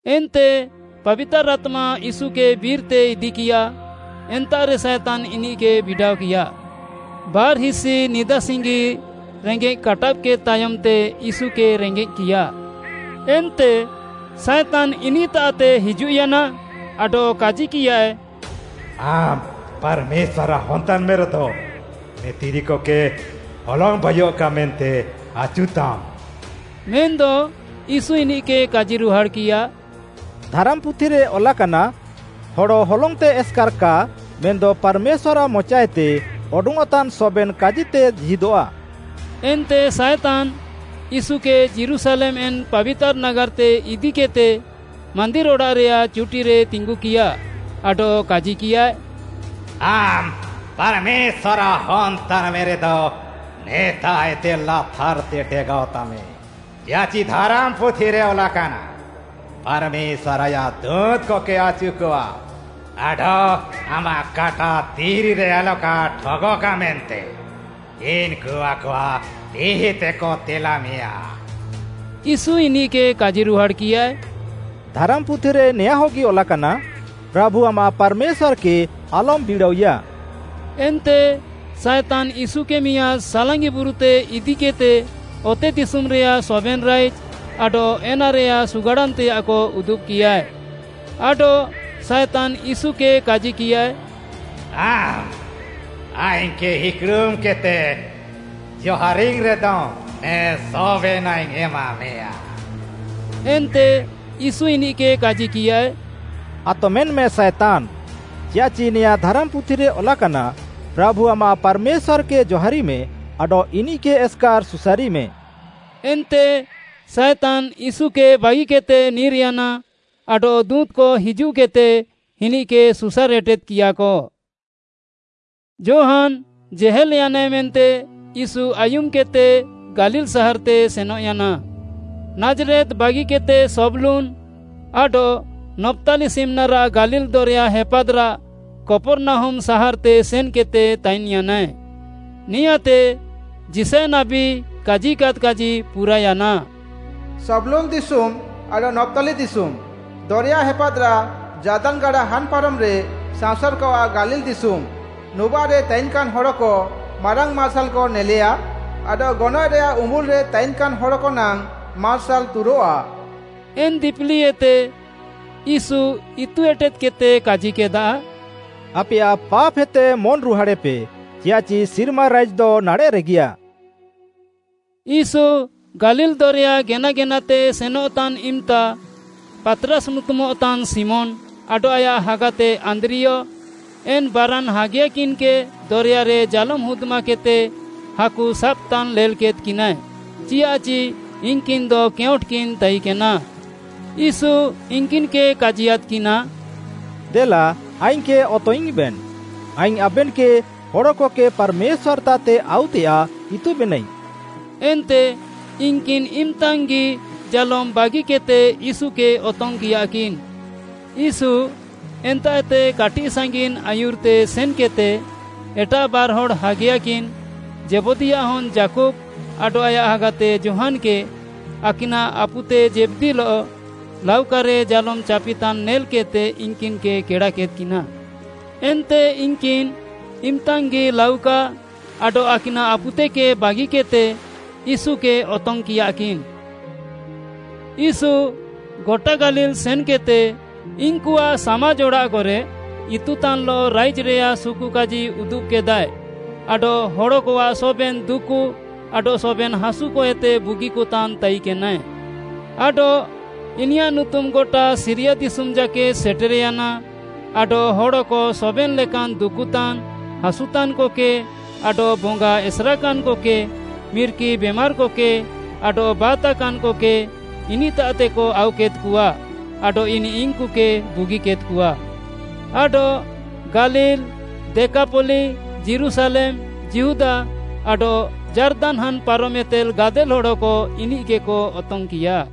ଏନ୍ତେ ପାବିତାର୍‌ ଆତ୍ମା ୟୀଶୁକେ ବିର୍‌ତେ ଇଦିକିୟା, ଏନ୍ତାଃରେ ସାଏତାନ୍‌ ଇନିଃକେ ବିଡ଼ାଅକିୟା। ବାର୍‌ହିସି ନିଦାସିଙ୍ଗି ରେଙ୍ଗେଃ କାଟାବ୍‌କେଦ୍‍ ତାୟମ୍‌ତେ ୟୀଶୁକେ ରେଙ୍ଗେଜ୍‌କିୟାଃ। ଏନ୍ତେ ସାଏତାନ୍‌ ଇନିଃତାଃତେ ହିଜୁଃୟାନା ଆଡଃ କାଜିକିୟାଏ, “ଆମ୍‌ ପାର୍‌ମେଶ୍ୱାର୍‌ଆଃ ହନ୍‌ ତାନ୍‌ମେରେଦ, ନେ ଦିରିକକେ ହଲଙ୍ଗ୍‌ ବାଇୟଃକା ମେନ୍ତେ ଆଚୁତାମ୍‌।” ମେନ୍‌ଦ ୟୀଶୁ ଇନିଃକେ କାଜିରୁହାଡ଼୍‌କିୟା, “ଧାରାମ୍‌ପୁଥିରେ ଅଲାକାନା, ‘ହଡ଼ ହଲଙ୍ଗ୍‌ତେ ଏସ୍‌କାର୍‌ କା ମେନ୍‌ଦ ପାର୍‌ମେଶ୍ୱାର୍‌ଆଃ ମଚାଏତେ ଅଡଙ୍ଗ୍‌ଅଃତାନ୍‌ ସବେନ୍‌ କାଜିତେ ଜୀହିଦଃଆ।’” ଏନ୍ତେ ସାଏତାନ୍‌ ୟୀଶୁକେ ଯୀରୁଶାଲେମ୍‌ ଏନ୍‌ ପାବିତାର୍‌ ନାଗାର୍‌ତେ ଇଦିକିଃତେ ମାନ୍ଦିର୍‌ ଅଡ଼ାଃରେୟାଃ ଚୁଟିରେ ତିଙ୍ଗୁକିୟା, ଆଡଃ କାଜିକିୟାଏ, “ଆମ୍‌ ପାର୍‌ମେଶ୍ୱାର୍‌ଆଃ ହନ୍‌ ତାନ୍‌ମେରେଦ ନେତାଃଏତେ ଲାତାର୍‌ତେ ଡେଗାଅତାମେ, ଚିୟାଃଚି ଧାରାମ୍‌ପୁଥିରେ ଅଲାକାନା, “‘ପାର୍‌ମେଶ୍ୱାର୍‌ ଆୟାଃ ଦୁଁତ୍‌କକେ ଆଚୁକଆ; ଆଡଃ ଆମାଃ କାଟା ଦିରିରେ ଆଲକା ଠଗଃକା ମେନ୍ତେ ଇନ୍‌କୁ ଆକଆଃ ତିଃଇତେକ ତେଲାମେୟାଁ।’” ୟୀଶୁ ଇନିଃକେ କାଜିରୁହାଡ଼୍‌କିୟାଏ, “ଧାରାମ୍‌ପୁଥିରେ ନେଆଁଁହଗି ଅଲାକାନା, ‘ପ୍ରାଭୁ ଆମାଃ ପାର୍‌ମେଶ୍ୱାର୍‌କେ ଆଲମ୍‌ ବିଡ଼ାଅଇୟା।’” ଏନ୍ତେ ସାଏତାନ୍‌ ୟୀଶୁକେ ମିଆଁଦ୍‌ ସାଲାଙ୍ଗି ବୁରୁତେ ଇଦିକିଃତେ ଅତେଦିଶୁମ୍‌ରେୟାଃ ସବେନ୍‌ ରାଇଜ୍‌ ଆଡଃ ଏନାରେୟାଃ ସୁଗାଡ଼ାନ୍‌ତେୟାଃକ ଉଦୁବ୍‌କିୟାଏ। ଆଡଃ ସାଏତାନ୍‌ ୟୀଶୁକେ କାଜିକିୟାଏ, “ଆମ୍‌ ଆଇଙ୍ଗ୍‌କେ ଇକ୍‌ଡ଼ୁମ୍‌କେଦ୍‌ତେ ଜହାରିଙ୍ଗ୍‌ରେଦମ୍ ନେ ସବେନାଃଇଙ୍ଗ୍‌ ଏମାମେୟାଁ।” ଏନ୍ତେ ୟୀଶୁ ଇନିଃକେ କାଜିକିୟାଏ, “ଆତମେନ୍‌ମେ ସାଏତାନ୍‌, ଚିୟାଃଚି ନେଆଁଁ ଧାରାମ୍‌ପୁଥିରେ ଅଲାକାନା, ‘ପ୍ରାଭୁ ଆମାଃ ପାର୍‌ମେଶ୍ୱାର୍‌କେ ଜହାରିମେ ଆଡଃ ଇନିଃକେ ଏସ୍‌କାର୍‌ ସୁସାରିମେ।’” ଏନ୍ତେ ସାଏତାନ୍‌ ୟୀଶୁକେ ବାଗିକେଦ୍‌ତେ ନିର୍‌ୟାନା ଆଡଃ ଦୁଁତ୍‌କ ହିଜୁଃକେଦ୍‌ତେ ଇନିଃକେ ସୁସାର୍‌ ଏଟେଦ୍‌କିୟାକ। ଯୋହାନ୍‌ ଜେହେଲ୍‌ୟାନାଏ ମେନ୍ତେ ୟୀଶୁ ଆୟୁମ୍‌କେଦ୍‌ତେ ଗାଲିଲ୍‌ ସାହାର୍‌ତେ ସେନଃୟାନା। ନାଜ୍‌ରେତ୍‌ ବାଗିକେଦ୍‌ତେ ସବ୍‌ଲୁନ୍‌ ଆଡଃ ନପ୍ତାଲି ସିମ୍‌ନାରାଃ ଗାଲିଲ୍‌ ଦରେୟା ହେପାଦ୍‌ରାଃ କପର୍‌ନାହୁମ୍‌ ସାହାର୍‌ତେ ସେନ୍‌କେଦ୍‌ତେ ତାଇନ୍‌ୟାନାଏ। ନେଆଁଁତେ ଯିଶାୟ ନାବୀ କାଜିକାଦ୍ କାଜି ପୁରାୟାନା, “ସବ୍‌ଲୁନ୍‌ ଦିଶୁମ୍‌ ଆଡଃ ନପ୍ତାଲି ଦିଶୁମ୍‌, ଦରେୟା ହେପାଦ୍‌ରାଃ ଯାର୍ଦାନ୍‌ ଗାଡ଼ା ହାନ୍‌ ପାରମ୍‌ରେ ସାଅଁସାର୍‌କଆଃ ଗାଲିଲ୍‌ ଦିଶୁମ୍‌, ନୁବାଃରେ ତାଇନ୍‌କାନ୍‌ ହଡ଼କ ମାରାଙ୍ଗ୍‌ ମାର୍ସାଲ୍‌କ ନେଲେୟା ଆଡଃ ଗନଏଃରେୟାଃ ଉମ୍ବୁଲ୍‌ରେ ତାଇନ୍‌କାନ୍‌ ହଡ଼କ ନାଙ୍ଗ୍‌ ମାର୍ସାଲ୍‌ ତୁରଃଆ।” ଏନ୍‌ ଦିପିଲିଏତେ ୟୀଶୁ ଇତୁ ଏଟେଦ୍‌କେଦ୍‌ତେ କାଜିକେଦା, “ଆପେୟାଃ ପାପ୍‌ହେତେ ମନ୍‌ରୁହାଡ଼େପେ ଚିୟାଃଚି ସିର୍ମା ରାଇଜ୍‌ଦ ନାଡ଼େଃରେଗିୟାଃ।” ୟୀଶୁ ଗାଲିଲ୍‌ ଦରେୟା ଗେନାଗେନାତେ ସେନଃତାନ୍‌ ଇମ୍‌ତା, ପାତ୍‌ରାସ୍‌ ନୁତୁମଃତାନ୍‌ ଶିମୋନ୍‌ ଆଡଃ ଆୟାଃ ହାଗାତେ ଆନ୍ଦ୍ରିୟ, ଏନ୍‌ ବାରାନ୍‌ ହାଗିୟାକିନ୍‌କେ ଦରେୟାରେ ଜାଲୋମ୍‌ ହୁଦ୍‌ମାକେଦ୍‌ତେ ହାକୁ ସାବ୍‌ତାନ୍‌ ନେଲ୍‌କେଦ୍‌କିନାଏ, ଚିୟାଃଚି ଇନ୍‌କିନ୍‌ଦ କେଉଁଟ୍‌କିନ୍ ତାଇକେନା। ୟୀଶୁ ଇନ୍‌କିନ୍‌କେ କାଜିୟାଦ୍‌କିନା, “ଦେଲା ଆଇଙ୍ଗ୍‌କେ ଅତଙ୍ଗ୍‌ଇଙ୍ଗ୍‌ବେନ୍‌, ଆଇଙ୍ଗ୍‌ ଆବେନ୍‌କେ ହଡ଼କକେ ପାର୍‌ମେଶ୍ୱାର୍‌ତାଃତେ ଆଉତେୟାଃ ଇତୁବେନାଇଙ୍ଗ୍‌।” ଏନ୍ତେ ଇନ୍‌କିନ୍‌ ଇମ୍‌ତାଙ୍ଗ୍‌ଗି ଜାଲୋମ୍‌ ବାଗିକେଦ୍‌ତେ ୟୀଶୁକେ ଅତଙ୍ଗ୍‌କିୟାକିନ୍‌। ୟୀଶୁ ଏନ୍ତାଃଏତେ କାଟିଃସାଙ୍ଗିନ୍‌ ଆୟୁର୍‌ତେ ସେନ୍‌କେଦ୍‌ତେ ଏଟାଃ ବାର୍‌ହଡ଼୍‌ ହାଗିୟାକିନ୍‌, ଜେବଦୀୟାଃ ହନ୍‌ ଯାକୁବ୍‌ ଆଡଃ ଆୟାଃ ହାଗାତେ ଯୋହାନ୍‌କେ ଆକିନାଃ ଆପୁତେ ଜେବଦୀଲଃ ଲାଉକାରେ ଜାଲୋମ୍‌ ଚାପିତାନ୍‌ ନେଲ୍‌କେଦ୍‌ତେ ଇନ୍‌କିନ୍‌କେ କେଡ଼ାକେଦ୍‌କିନା। ଏନ୍ତେ ଇନ୍‌କିନ୍‌ ଇମ୍‌ତାଙ୍ଗ୍‌ଗି ଲାଉକା ଆଡଃ ଆକିନାଃ ଆପୁତେକେ ବାଗିକେଦ୍‌ତେ ୟୀଶୁକେ ଅତଙ୍ଗ୍‌କିୟାକିନ୍‌। ୟୀଶୁ ଗଟା ଗାଲିଲ୍‌ ସେନ୍‌କେଦ୍‌ତେ ଇନ୍‌କୁଆଃ ସାମାଜ୍‌ ଅଡ଼ାଃକରେ ଇତୁତାନ୍‌ଲଃ ରାଇଜ୍‌ରେୟାଃ ସୁକୁକାଜି ଉଦୁବ୍‍କେଦାଏ ଆଡଃ ହଡ଼କଆଃ ସବେନ୍‌ ଦୁକୁ ଆଡଃ ସବେନ୍‌ ହାସୁକଏତେ ବୁଗିକତାନ୍‌ ତାଇକେନାଏ। ଆଡଃ ଇନିୟାଃ ନୁତୁମ୍‌ ଗଟା ସିରିୟା ଦିଶୁମ୍‌ ଜାକେଦ୍‌ ସେଟେର୍‌ୟାନା ଆଡଃ ହଡ଼କ ସବେନ୍‌ ଲେକାନ୍‌ ଦୁକୁତାନ୍‌, ହାସୁତାନ୍‌କକେ ଆଡଃ ବଙ୍ଗା ଏସେର୍‌କାନ୍‌କକେ, ମିର୍କି ବେମାର୍‌କକେ, ଆଡଃ ବାତ୍‌ତାକାନ୍‌କକେ ଇନିଃତାଃତେକ ଆଉକେଦ୍‌କଆ ଆଡଃ ଇନିଃ ଇନ୍‌କୁକେ ବୁଗିକେଦ୍‌କଆ। ଆଡଃ ଗାଲିଲ୍‌, ଦେକାପଲ୍ଲୀ, ଯୀରୁଶାଲେମ୍‌, ଯିହୁଦା ଆଡଃ ଯାର୍ଦାନ୍‌ ହାନ୍‌ ପାରମ୍‌ଏତେ ଗାଦେଲ୍‌ ହଡ଼କ ଇନିଃକେକ ଅତଙ୍ଗ୍‌କିୟା।